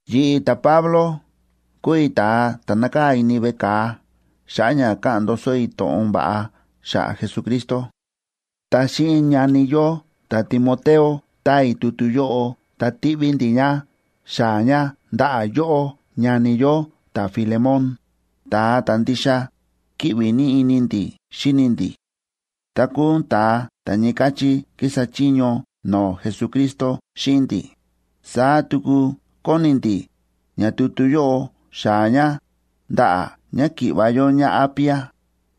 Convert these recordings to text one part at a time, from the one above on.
Yi̱ꞌi̱, ta̱Pablo, kúu i̱ ta̱a ta̱ nákaa̱ ini veꞌe ka̱a xa̱ꞌa̱ ña káꞌa̱n ndoso i̱ to̱ꞌon va̱ꞌa xa̱ꞌa̱ Jesucristo. Ta xíꞌin ñani yó ta̱Timoteo táa i̱ tutu yóꞌo ta tíꞌví ndi̱ ña xaa̱ ña ndaꞌa̱ yóꞌó, ñani yó ta̱Filemón, ta̱a ta̱ ndixa kíꞌvi ní ini ndi̱ xíni ndi̱, ta kúu ún ta̱a ta̱ ñii káchí kísa chiño no̱o̱ Jesucristo xíꞌin ndi̱. Saá tuku kóni ndi̱ ña tutu yóꞌo xaa̱ ña ndaꞌa̱ ñáki̱ꞌva̱ yó ñáApia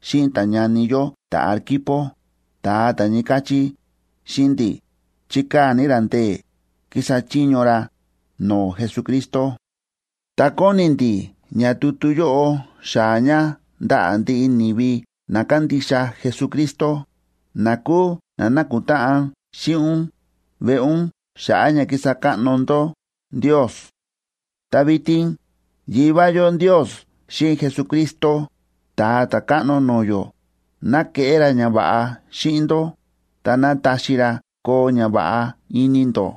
xíꞌin ta̱ñani yó ta̱Arquipo, ta̱a ta ñii káchí xíꞌin ndi̱ chíkaa̱ ní ra ndee̱ kísa chiño ra no̱o̱ Jesucristo. Ta kóni ndi̱ ña tutu yóꞌo xaa̱ ña ndaꞌa̱ ndiꞌi ni̱vi na kándixa Jesucristo, na kúu na nákutáꞌan xíꞌin ún veꞌe ún xa̱ꞌa̱ ña kísa káꞌno ndó Ndios. Ta vitin Yivá yó Ndios xíꞌin Jesucristo, Ta̱a Ta̱káꞌno no̱o̱ yó, ná keꞌé ra ñava̱ꞌa xíꞌin ndó, ta ná taxi ra koo ñava̱ꞌa ini ndó.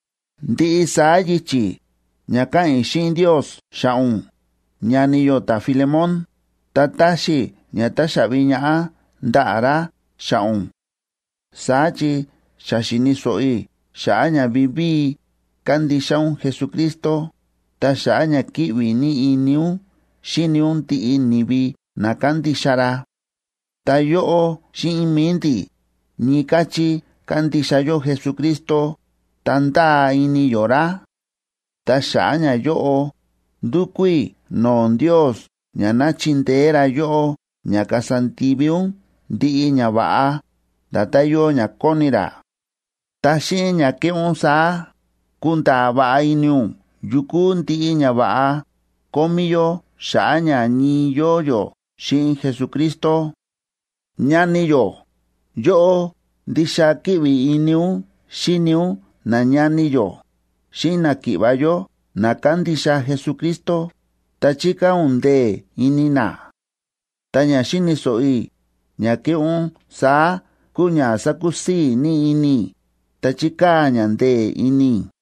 Ndiꞌi saá yichi̱ ña káꞌa̱n i̱ xíꞌin Ndios xa̱ꞌa̱ ún, ñani yó ta̱Filemón, ta táxi i̱ ña taxaꞌvi ñaꞌá ndaꞌa̱ ra xa̱ꞌa̱ ún. Saá chi xa xi̱ni̱ so̱ꞌo i̱ xa̱ꞌa̱ ña vivíi kándixa ún Jesucristo, ta xa̱ꞌa̱ ña kíꞌvi ní ini ún xíni ún ndiꞌi ni̱vi na kándixa ra. Ta yóꞌó xíꞌin mi̱i ndi̱, ñii káchí kándixa yó Jesucristo ta ndáa ini yó ra. Ta xa̱ꞌa̱ ñayóꞌo, ndúkú i̱ no̱o̱ Ndios ña ná chindeé ra yóꞌó ña kasa ndivi ún ndiꞌi ñava̱ꞌa nda̱tán yóo ña kóni ra. Ta xíꞌin ña keꞌé ún saá, kunda̱a̱ va̱ꞌa ini ún yu kúu ndiꞌi ñava̱ꞌa kómí yó xa̱ꞌa̱ ña ñii yóo yó xíꞌin Jesucristo. Ñani yó, yóꞌó ndixa kíꞌvi ini ún xíni ún nañani yó xíꞌin náki̱ꞌva̱ yó na kándixa Jesucristo, ta chíkaa̱ ún ndee̱ ini na. Ta ña xi̱ni̱ so̱ꞌo i̱ ña kéꞌé ún saá kúu ña sákusii̱ ní ini i̱ ta chíkaa̱ ña ndee̱ ini i̱.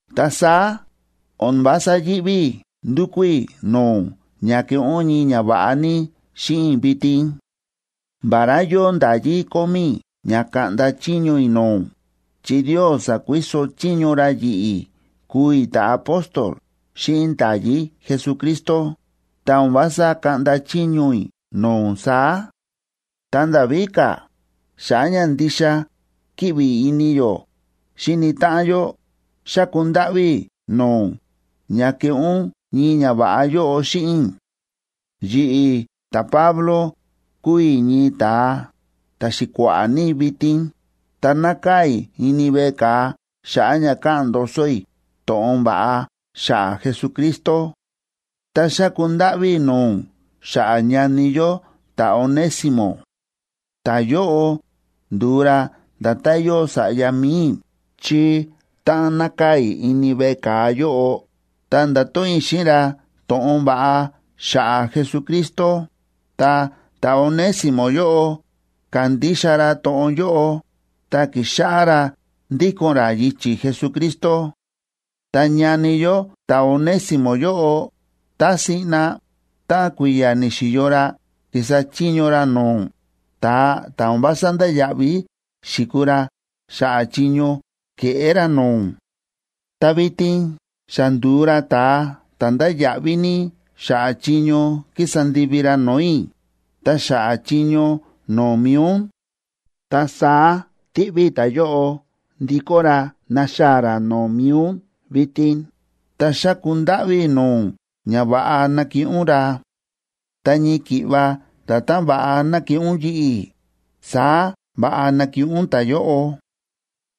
Ta saá o̱n vása yíꞌví i̱ ndukú i̱ no̱o̱ ún ña keꞌé ún ñii ñava̱ꞌa ní xíꞌin i̱ vitin. Vará yóo nda̱yí kómí i̱ ña kaꞌnda chiño i̱ no̱o̱ ún chi Ndios sa̱kuiso chiño ra yi̱ꞌi̱ kúu i̱ ta̱apóstol xíꞌin nda̱yí Jesucristo, ta o̱n vása kaꞌnda chiño i̱ no̱o̱ ún saá. Ta nda̱ víka̱, xa̱ꞌa̱ ña ndixa kíꞌvi ini yó xíni táꞌan yó, xáku ndáꞌví i̱ no̱o̱ ún ña keꞌé ún ñii ñava̱ꞌa yóꞌo xíꞌin i̱. Yi̱ꞌi̱, ta̱Pablo, kúu i̱ ñii ta̱a ta̱xi̱kua̱ꞌa̱ ní vitin, ta nákaa̱ i̱ ini veꞌe ka̱a xa̱ꞌa̱ ña káꞌa̱n ndoso i̱ to̱ꞌon va̱ꞌa xa̱ꞌa̱ Jesucristo, ta xáku ndáꞌví i̱ no̱o̱ ún xa̱ꞌa̱ ñani yó ta̱Onésimo. Ta̱yóꞌo ndu̱u ra nda̱tán yóo sa̱ꞌya mi̱i i̱, chi táꞌan nákaa̱ i̱ ini veꞌe ka̱a yóꞌo, ta nda̱to̱ꞌon i̱ xíꞌin ra to̱ꞌon va̱ꞌa xa̱ꞌa̱ Jesucristo, ta ta̱Onésimo yóꞌo ka̱ndixa ra to̱ꞌon yóꞌo, ta ki̱xáꞌá ra ndíko̱n ra yichi̱ Jesucristo. Ta ñani yó ta̱Onésimo yóꞌo, tá siꞌna táꞌan kui̱ya̱ ni̱xi̱yo ra kísa chiño ra no̱o̱ ún, ta̱a ta̱ o̱n vása ndáya̱ꞌví xi̱kuu ra xa̱ꞌa̱ chiño ke̱ꞌé ra no̱o̱ ún. Ta vitin xa ndu̱u ra ta̱a ta̱ ndáya̱ꞌví ní xa̱ꞌa̱ chiño kísa ndivi ra no̱o̱ i̱ ta xa̱ꞌa̱ chiño no̱o̱ mi̱i ún. Ta saá tíꞌví i̱ ta̱yóꞌo ndikó ra naxaa̱ ra no̱o̱ mi̱i ún vitin, ta xáku ndáꞌví i̱ no̱o̱ ún ña va̱ꞌa nakiꞌin ún ra. Ta ñii ki̱ꞌva nda̱tán va̱ꞌa nakiꞌin ún yi̱ꞌi̱, saá va̱ꞌa nakiꞌin ún ta̱yóꞌo.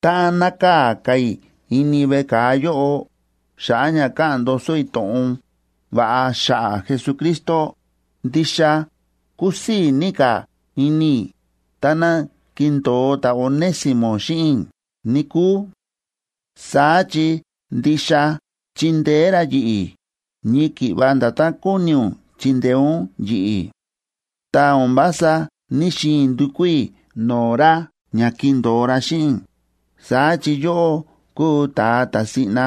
Táꞌan nákaa̱ ka̱ i̱ ini veꞌe ka̱a yóꞌo, xa̱ꞌa̱ ña káꞌa̱n ndoso i̱ to̱ꞌon va̱ꞌa xa̱ꞌa̱ Jesucristo, ndixa kusii̱ ní ka̱ ini i̱ táná kindo̱o ta̱Onésimo xíꞌin i̱, níkúu. Saá chi ndixa chindeé ra yi̱ꞌi̱ ñii ki̱ꞌva nda̱tán kóni ún chindeé ún yi̱ꞌi̱. Ta o̱n vása ní‑xiin i̱ ndukú i̱ no̱o̱ ra ña kindo̱o ra xíꞌin i̱, saá chi yóꞌó kúu ta̱a ta̱ siꞌna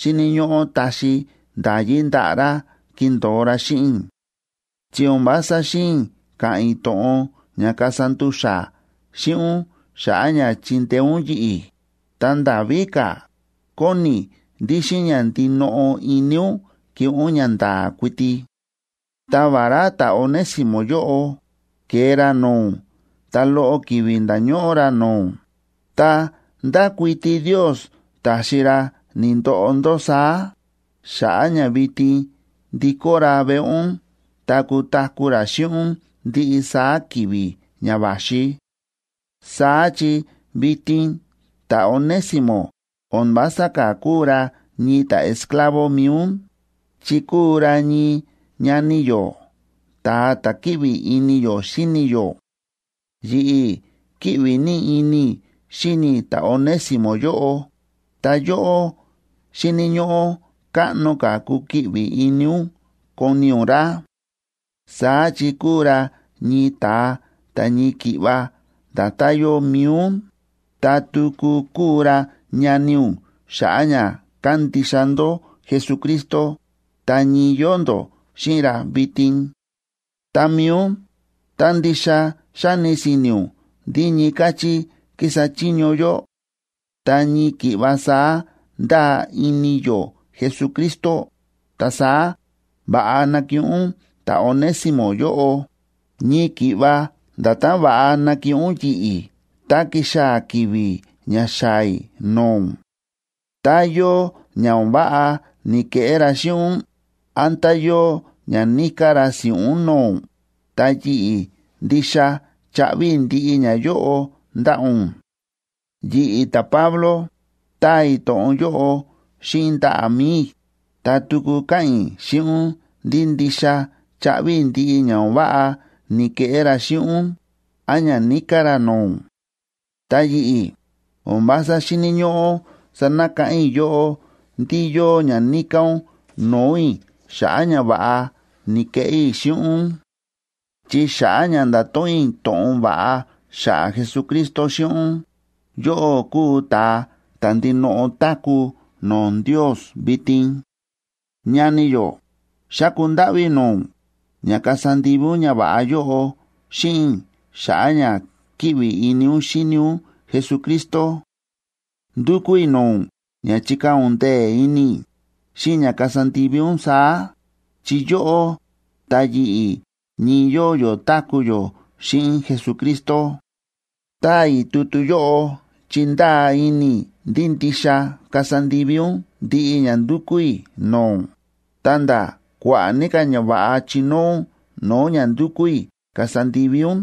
xíni̱ ñóꞌó taxi nda̱yí ndaꞌa̱ ra kindo̱o ra xíꞌin i̱. Chi o̱n vása xi̱in i̱ ka̱ꞌa̱n i̱ to̱ꞌon ña kasa ndu̱xa̱ xíꞌin ún xa̱ꞌa̱ ña chindeé ún yi̱ꞌi̱, ta nda̱ víka̱, kóni i̱ ndí xíꞌin ña ndinoꞌo ini ún keꞌé ún ñanda̱a̱ kuiti. Ta vará ta̱Onésimo yóꞌo ke̱e ra no̱o̱ ún ta loꞌo ki̱vi̱ nda̱ñóꞌó ra no̱o̱ ún, ta ndákuiti Ndios ta̱xi ra ni̱ndoꞌo ndó saá, xa̱ꞌa̱ ña vitin ndikó ra veꞌe ún ta kutaku̱ ra xíꞌin ún ndiꞌi saá ki̱vi̱ ña va̱xi. Saá chi vitin ta̱Onésimo o̱n vása ka̱ kúu ra ñii ta̱esclavo mi̱i ún,a chi kúu ra ñii ñani yó, ta̱a ta̱ kíꞌvi ini yó xíni yó. Yi̱ꞌi̱ kíꞌvi ní ini i̱ xíni i̱ ta̱Onésimo yóꞌo, ta yóꞌó xíni̱ ñóꞌó káꞌno ka̱ kukiꞌvi ini ún koni ún ra. Saá chi kúu ra ñii ta̱a ta̱ ñii ki̱ꞌva nda̱tán yóo mi̱i ún, ta tuku kúu ra ñani ún xa̱ꞌa̱ ña kándixa ndó Jesucristo ta ñii yóo ndó xíꞌin ra vitin. Ta mi̱i ún, tá ndixa xáni si̱ni̱ ún ndí ñii káchí kísa chiño yó ta ñii ki̱ꞌva saá ndáa ini yó Jesucristo, ta saá va̱ꞌa nakiꞌin ún ta̱Onésimo yóꞌo, ñii ki̱ꞌva nda̱tán va̱ꞌa nakiꞌin ún yi̱ꞌi̱ tá kixaa̱ ki̱vi̱ ña xaa̱ i̱ no̱o̱ ún. Tá yóo ña o̱n váꞌa ni̱keꞌé ra xíꞌin ún, án tá yóo ña níká ra si̱ꞌún no̱o̱ ún, ta yi̱ꞌi̱ ndixa chaꞌvi i̱ ndiꞌi ñayóꞌo ndaꞌa̱ ún. Yi̱ꞌi̱, ta̱Pablo, táa i̱ to̱ꞌon yóꞌo xíꞌin ndaꞌa̱ mi̱i i̱, ta tuku káꞌa̱n i̱ xíꞌin ún ndí ndixa chaꞌvi i̱ ndiꞌi ña o̱n váꞌa ni̱keꞌé ra xíꞌin ún án ña níká ra no̱o̱ ún. Ta yi̱ꞌi̱, o̱n vása xíni̱ ñóꞌó sanakáꞌán i̱ yóꞌó ndí yóo ña níká ún no̱o̱ i̱ xa̱ꞌa̱ ñava̱ꞌa ni̱keꞌé i̱ xíꞌin ún. Chi xa̱ꞌa̱ ña nda̱to̱ꞌon i̱ to̱ꞌon va̱ꞌa xa̱ꞌa̱ Jesucristo xíꞌin ún, yóꞌó kúu ta̱a ta̱ ndinoꞌo táku̱ no̱o̱ Ndios vitin. Ñani yó, xáku ndáꞌví i̱ no̱o̱ ún ña kasa ndivi ún ñava̱ꞌa yóꞌo xíꞌin i̱ xa̱ꞌa̱ ña kíꞌvi ini ún xíni ún Jesucristo. Ndúkú i̱ no̱o̱ ún ña chikaa̱ ún ndee̱ ini i̱ xíꞌin ña kasa ndivi ún saá, chi yóꞌó ta yi̱ꞌi̱ ñii yóo yó táku̱ yó xíꞌin Jesucristo. Táa i̱ tutu yóꞌo chi ndáa ini i̱ ndí ndixa kasa ndivi ún ndiꞌi ña ndúkú i̱ no̱o̱ ún, ta̱nda̱ kua̱ꞌa̱ ní ka̱ ñava̱ꞌa chinóo ún no̱o̱ ña ndúkú i̱ kasa ndivi ún.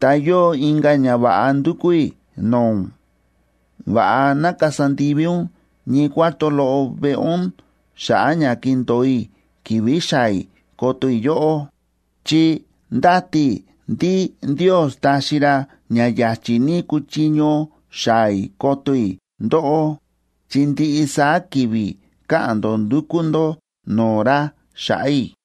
Ta yóo inka̱ ñava̱ꞌa ndúkú i̱ no̱o̱ ún: Va̱ꞌa ná kasa ndivi ún ñii cuarto loꞌo veꞌe ún xa̱ꞌa̱ ña kindo̱o i̱ ki̱vi̱ xaa̱ i̱ koto i̱ yóꞌó, chi ndáti i̱ ndí Ndios taxi ra ña ya̱chi̱ ní kuchiño xaa̱ i̱ koto i̱ ndóꞌó, chi ndiꞌi saá ki̱vi̱ káꞌa̱n ndó ndúkú ndó no̱o̱ ra xa̱ꞌa̱ i̱.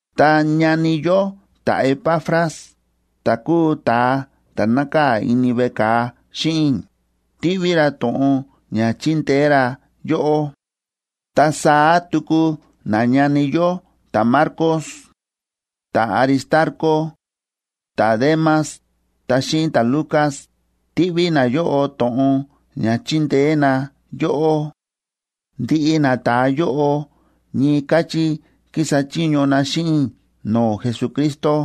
Ta ñani yó ta̱Epafras, ta̱ kúu ta̱a ta̱ nákaa̱ ini veꞌe ka̱a xíꞌin i̱, tíꞌví ra to̱ꞌon ña chindeé ra yóꞌó. Ta saá tuku nañani yó ta̱Marcos, ta̱Aristarco, ta̱Demas ta xíꞌin ta̱Lucas tíꞌví nayóꞌo to̱ꞌon ña chindeé na yóꞌó. Ndiꞌi nata̱a yóꞌo ñii káchí kísa chiño na xíꞌin i̱ no̱o̱ Jesucristo.